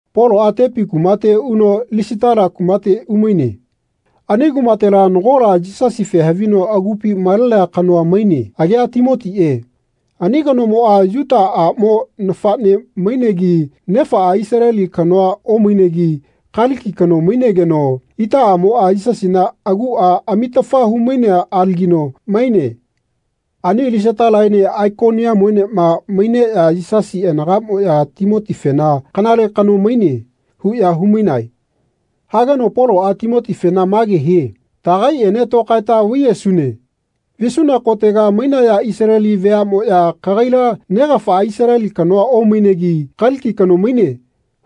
Poloꞌa Tepi kumate uno Lisitala kumate umaine. Ani kumatela nagola Yisasife havino agupi malenea kanoa maine. Agia Timotiꞌe. Ani kanomoꞌa Yuta aꞌmo nafaꞌne mainegi nefaꞌa Isaleli kanoa omainegi, Kaliki kano mainegeno, itaꞌamoꞌa Yisasina aguꞌa amitafa humainea alagino maine. Ani Lisatalaene Aikoniamuenema maineꞌya Yisasi anagaꞌmoꞌya Timotifena “Kanale kano maine.” huꞌya humainae. Hageno Poloꞌa Timotifena mage hie “Taꞌagaiꞌene tokaeta vaiyesune.” Visuna kotega mainaya Isaleli veaꞌmoꞌya kagaila negafaꞌa Isaleli kanoa omainegi, Kaliki kano maine,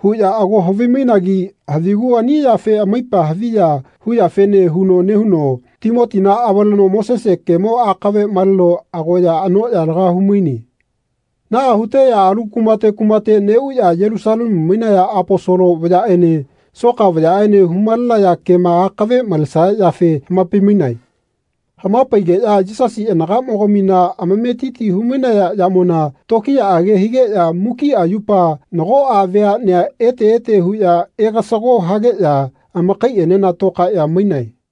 huꞌya ago havimainagi havigu ani yafe amaipa haviya huyafene huno nehuno Timotina avaleno Mosese kemo akave maleno agoya anoꞌya laga humaine. Naꞌa huteꞌya alu kumate kumate neꞌuꞌya Yelusalemu mainaya Aposolo vayaꞌene soka vayaꞌene humalenaya kema akave malesaya yafe hamapai-mainae. Hamapaigeꞌya Yisasi anagaꞌmogamina amametiti humainaya yamona tokiyaꞌage higeꞌya mukiꞌa yupa nagoꞌa veaꞌnea ete ete huꞌya egasago hageꞌya amakaiꞌenena tokaeꞌya mainae.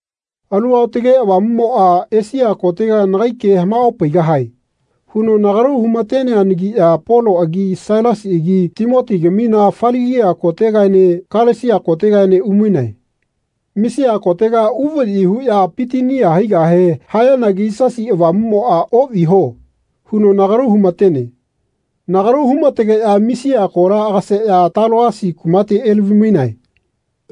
Alu Aotage Avamuꞌmoꞌa “Esia kotega nagai ke hamaopaigahae.” huno nagalu humateneanagiꞌya Poloꞌagi Sailasiꞌagi Timotigamina Faligia kotegaene Kalesia kotegaene umainae. Misia kotega uvaꞌyi huꞌya Pitinia haigahe hayanagi Yisasi Avamuꞌmoꞌa “Oꞌviho.” huno nagalu humatene. Nagalu humategeꞌya Misia kola agaseꞌya Taloasi kumate elavi-mainae.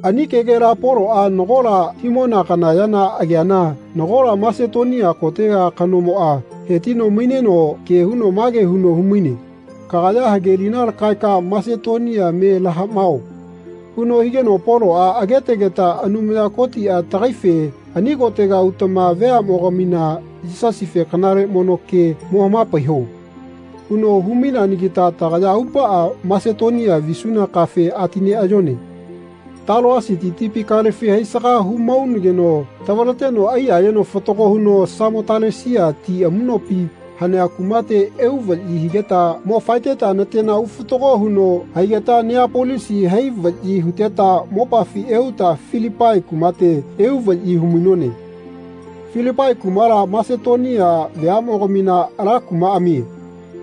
Ani kegela Poloꞌa nagola himona kana ya ageana nagola Masetonia kotega kanomoꞌa hetino maineno ke huno mage huno humaine “Kagaya hagelina lakaeka Masetonia me lahaꞌmao.” huno higeno Poloꞌa agetegeta Anumaya Kotiꞌa tagaife “Ani kotega utama veaꞌmogamina Yisasife kanale mono ke mo hamapaiho.” huno humaineanagita tagaya aupaꞌa Masetonia visuna kafe atineꞌayone. Taloasiti tipi kalefi haisaga humaunageno tavaleteno aiyayeno fatago huno Samotalesia ti amuꞌnopi hanea kumate euvaꞌyi higeta mo faeteta natena ufatago huno haigeta Neapolisi hai vaꞌyi huteta mopafi euta Filipai kumate euvaꞌyi humainone. Filipai kumala Masetonia veaꞌmogamina ala kumaꞌamie.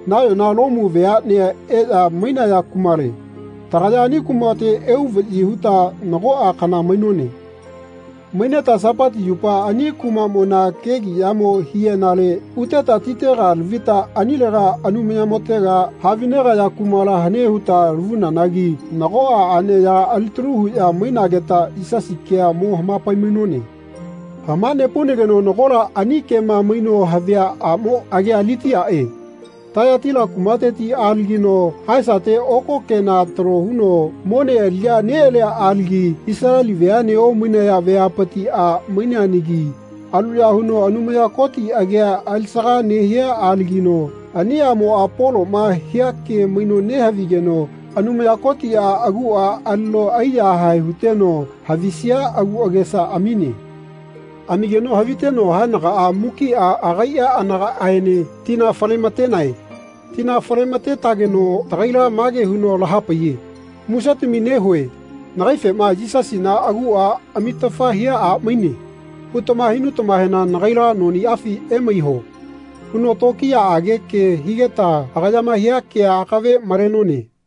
Nayona Lomu veaꞌnea eꞌya mainaya kumale. Tagaya ani kumate euvaꞌyi huta nagoꞌa kana mainone. Maineta Sapati yupa ani kumaꞌmona kegiꞌyamo hiꞌyenale uteta titega lavita anilega Anumayamotega havinegaya kumala hane huta lavunanagi nagoꞌa aꞌneyaga alitalu huꞌya mainageta Yisasi kea mo hamapai-mainone. Hamanepaunageno nagola ani kema maino havia aꞌmo agia Litiaꞌe. Tayataila kumateti alagino haesate oko kena talo huno mone aliꞌya neꞌalia alagi Isaleli veaꞌne omainaya veapiti a maineanagi aluya huno Anumaya Koti agia alisaga nehia alagino ani aꞌmoꞌa Poloꞌma hia ke maino nehavigeno Anumaya Kotiꞌa aguꞌa alino aiyahae huteno havisia agu agesa amine. Amigeno haviteno haenagaꞌa mukiꞌa agaiꞌa anagaꞌaene tina fale-matenae. Tina fale-matetageno tagaila mage huno lahapaiye “Musetami nehue nagaifema ‘Yisasina aguꞌa amitafa hia a maine.’ hutama hinutamahena nagaila noniꞌafi emaiho.” huno tokiyaꞌage ke higeta agayama hia kea akave malenone.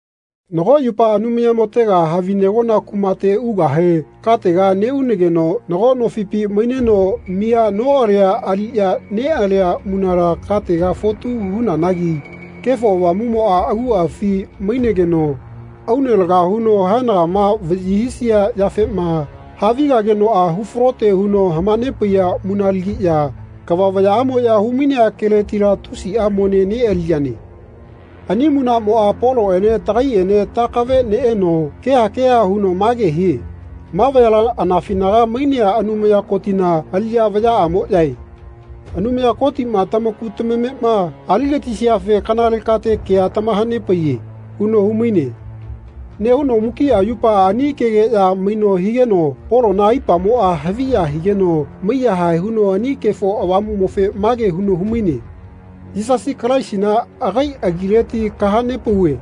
Nago yupa Anumayamotega havinegona kumate ugahe katega neꞌunageno nago nofipi maineno miya noꞌalia aliꞌya neꞌalia munala katega fotu hunanagi Kefo Avamuꞌmoꞌa aguꞌafi mainegeno aune laga huno haenagama vaꞌyi hisia yafema havigagenoꞌa hufalote huno hamanepaiya munalagiꞌya kava vayaꞌamoꞌya humainea keletila tusiꞌa mone neꞌaliyane. Ani munaꞌmoꞌa Poloꞌene tagaiꞌene takave neꞌeno keha keha huno mage hie “Ma vayala anafinaga mainea Anumaya Kotina aliꞌya vayaꞌamoꞌyae. Anumaya Kotiꞌma tamaku tamamema aligatisiafe kanale kate kea tamahanepaiye.” huno humaine. Nehuno mukiꞌa yupa ani kegeꞌya maino higeno Polona aipamoꞌa haviya higeno maiyahae huno ani Kefo Avamuꞌmofe mage huno humaine “Yisasi Kalaisina agai agileti kahanepauve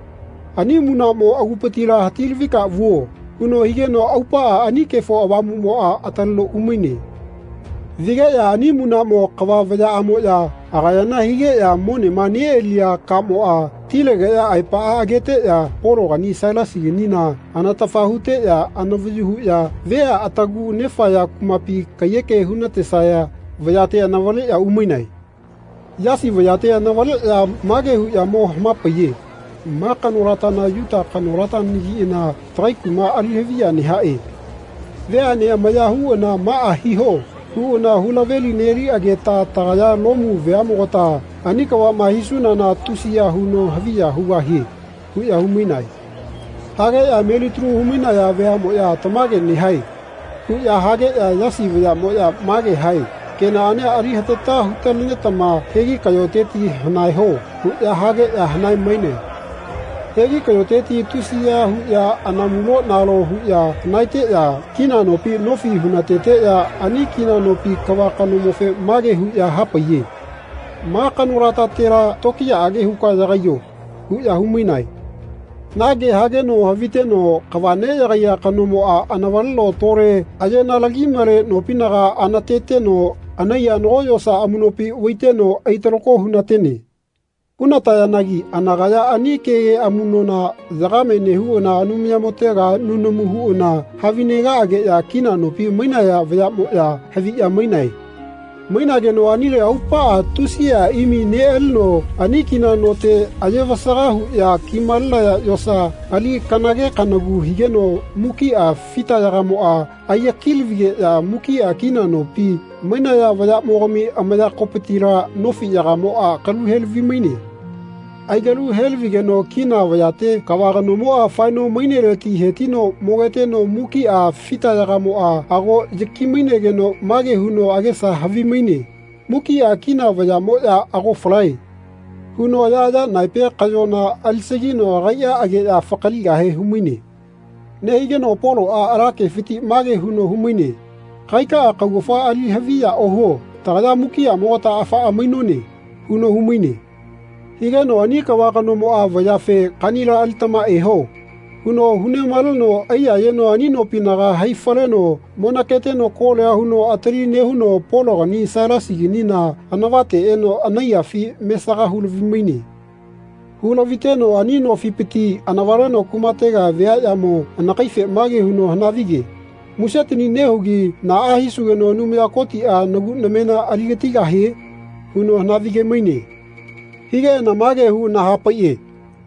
ani munaꞌmo agupitila hati-lavika vuo.” huno higeno aupaꞌa ani Kefo Avamuꞌmoꞌa ataleno umaine. Vigeꞌya ani munaꞌmo kava vayaꞌamoꞌya agayana higeꞌya monema neꞌaliya kamoꞌa tilegeꞌya aepaꞌa ageteꞌya Pologani Sailasiganina anatafa huteꞌya anavayu huꞌya vea atagu nefaya kumapi kaiyeke hunatesaya vayate anavaleꞌya umainae. Yasi vayate anavaleꞌya mage huꞌya mo hamapaiye “Ma kanolatana Yuta kanolatanagiꞌana tagai kuma alihaviya nehaꞌe. Veaꞌne amavaya huꞌana ‘Maꞌa hiho.’ huꞌana hulaveli-neliꞌageta tagaya Lomu veaꞌmogata ani kavaꞌma hisunana tusiya huno haviya hugahie.” huꞌya humainae. Hageꞌya melitalu humainaya veaꞌmoꞌya “Tamage nehae.” huꞌya hageꞌya Yasi vayaꞌmoꞌya mage hae “Kenaꞌania ali hatata hutalenetama hegi kaꞌyoteti hanaeho.” huꞌya hageꞌya hanae-mainae. Hegi kaꞌyoteti tusiya huꞌya anamulo-nalo huꞌya hanaeteꞌya kina nopi nofi hunateteꞌya ani kina nopi kava kanomofe mage huꞌya hapaiye “Ma kanolatatela tokiyaꞌage huka yagaiyo.” huꞌya humainae. Na ke hageno haviteno kava neꞌyagaiya kanomoꞌa anavaleno tole ayenalagi-male nopinaga anateteno anaiya nago yosa amuꞌnopi vaiteno aitalako hunatene. Hunatayanagi anakaya ani kege amuꞌnona yagame nehuꞌana Anumayamotega nunamu huꞌana havinegaꞌageꞌya kina nopi mainaya vayaꞌmoꞌya haviꞌya mainae. Mainageno anile aupaꞌa tusiꞌa imi neꞌalino ani kina note ayevasaga huꞌya kimalenaya yosa ali kanage kanagu higeno mukiꞌa fitayagamoꞌa aiyaki-lavigeꞌya mukiꞌa kina nopi mainaya vayaꞌmogami amayakopitila nofiꞌyagamoꞌa kaluhelavi-maine. Aikalu-helavigeno kina vayate kava kanomoꞌa faeno maineleti hetino mogeteno mukiꞌa fitayagamoꞌa ago yaki-mainegeno mage huno agesa havimaine “Mukiꞌa kina vayaꞌmoꞌya ago falae.” huno ayaꞌaya naepe kaꞌyona alisagino agaiꞌa ageꞌya fakaligahe humaine. Nehigeno Poloꞌa ala kefiti mage huno humaine “Kagaikaꞌa kaugafa ali haviya ohuo. Tagaya mukiꞌamogata afaꞌa mainone.” huno humaine. Higeno ani kava kanomoꞌa vayafe “Kaꞌnila alitama eho.” huno hunemaleno aiyayeno ani nopinaga hai-faleno monaketeno kolia huno atali nehuno Pologani Sailasiganina anavate eno anaiyafi mesaga hulavi-maine. Hu-laviteno ani nofipiti anavaleno kumatega viaꞌyamo anakaife mage huno hanavige “Musetani nehugi naꞌa hisugeno Anumaya Kotiꞌa nagu namena aligatigahie?” huno hanavige-maine. Higeꞌana mage huꞌana hapaiꞌe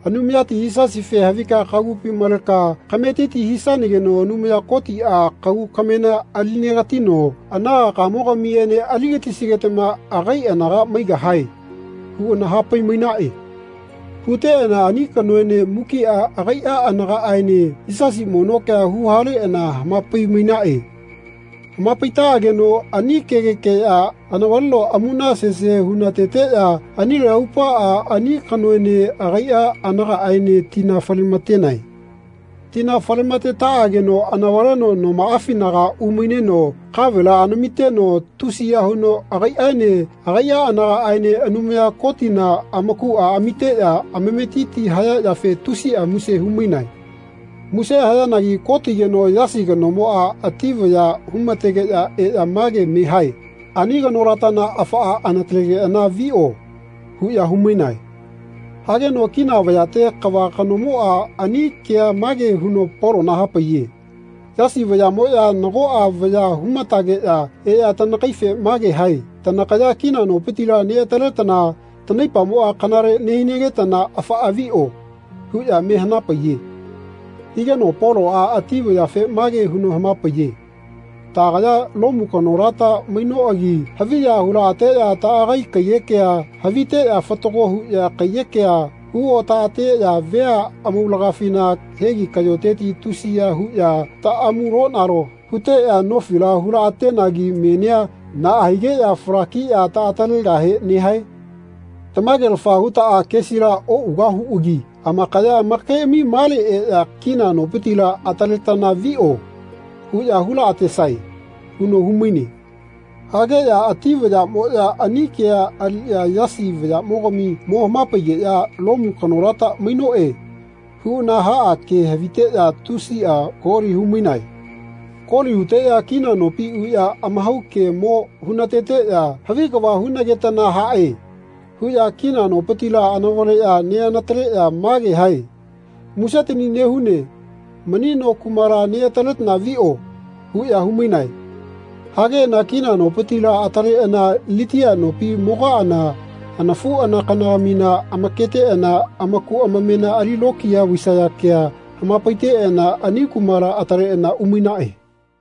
“Anumayati Yisasife havika kagupi maleka kametiti hisanageno Anumaya Kotiꞌa kagu kamena ali-negatino anagakamogamiene ali-gatisigetama agai anaga maigahae.” huꞌana hapai-mainaꞌe. Huteꞌana ani kanoene mukiꞌa agaiꞌa anagaꞌaene Yisasi mono kea huhaleꞌana hamapai-mainaꞌe. Hamapaitaꞌageno ani kegekeꞌya anavaleno amuna sese hunateteꞌya anile aupaꞌa ani kanoene agaiꞌa anagaꞌaene tina fale-matenaꞌe. Tina falematetaꞌageno anavaleno nomaꞌafinaga umaineno kavela anamiteno tusiya huno agaiꞌaene agaiꞌa anagaꞌaene Anumaya Kotina amakuꞌa amiteꞌya amametiti haya yafe tusiꞌa muse humainae. Muse hayanagi kotigeno Yasi kanomoꞌa ati vaya humategeꞌya eꞌya mage me hae “Ani kanolatana afaꞌa anatalegeꞌana viꞌo.” huꞌya humainae. Hageno kina vayate kava kanomoꞌa ani kea mage huno Polona hapaiye “Yasi vayaꞌmoꞌya nagoꞌa vaya humatageꞌya eꞌya tanakaife mage hae tanakaya kina nopitila neꞌataletana tanaipamoꞌa kanale nehinagetana afaꞌa viꞌo.” huꞌya me hanapaiye. Higeno Poloꞌa ati vayafe mage huno hamapaiye. “Taꞌagaya Lomu kanolata mainoꞌagi haviya hulaꞌateꞌya taꞌagai kaiyekea haviteꞌya fatago huꞌya kaiyekea huotaꞌateꞌya vea amaulagafina hegi kaꞌyoteti tusiya huꞌya taꞌamulonalo huteꞌya nofila hulaꞌatenagi menia naꞌa higeꞌya falakiꞌya taꞌatalegahe nehae? Tamagelafa hutaꞌa kesila oꞌugahuꞌagi amakaya amakaiꞌami male eꞌya ‘Kina nopitila ataletana viꞌo.’ huꞌya hulaꞌatesae.” huno humaine. Hageꞌya ati vayaꞌmoꞌya ani kea aliꞌya Yasi vayaꞌmogami mo hamapageꞌya “Lomu kanolata mainoꞌe.” huꞌana haꞌa ke haviteꞌya tusiꞌa koli humainae. Koli huteꞌya kina nopi uꞌya amahau ke mo hunateteꞌya “Havi kava hunagetana haꞌe.” huꞌya kina nopitila anavale neꞌanataleꞌya mage hae “Musetani nehune mani no kumala neꞌataletana viꞌo.” huꞌya humainae. Hageꞌana kina nopitila ataleꞌana Litia nopi mogaꞌana anafuꞌanakanagamina amaketeꞌana amaku amamena ali lokiya vaisaya kea hamapaiteꞌana ani kumala ataletana umainaꞌe.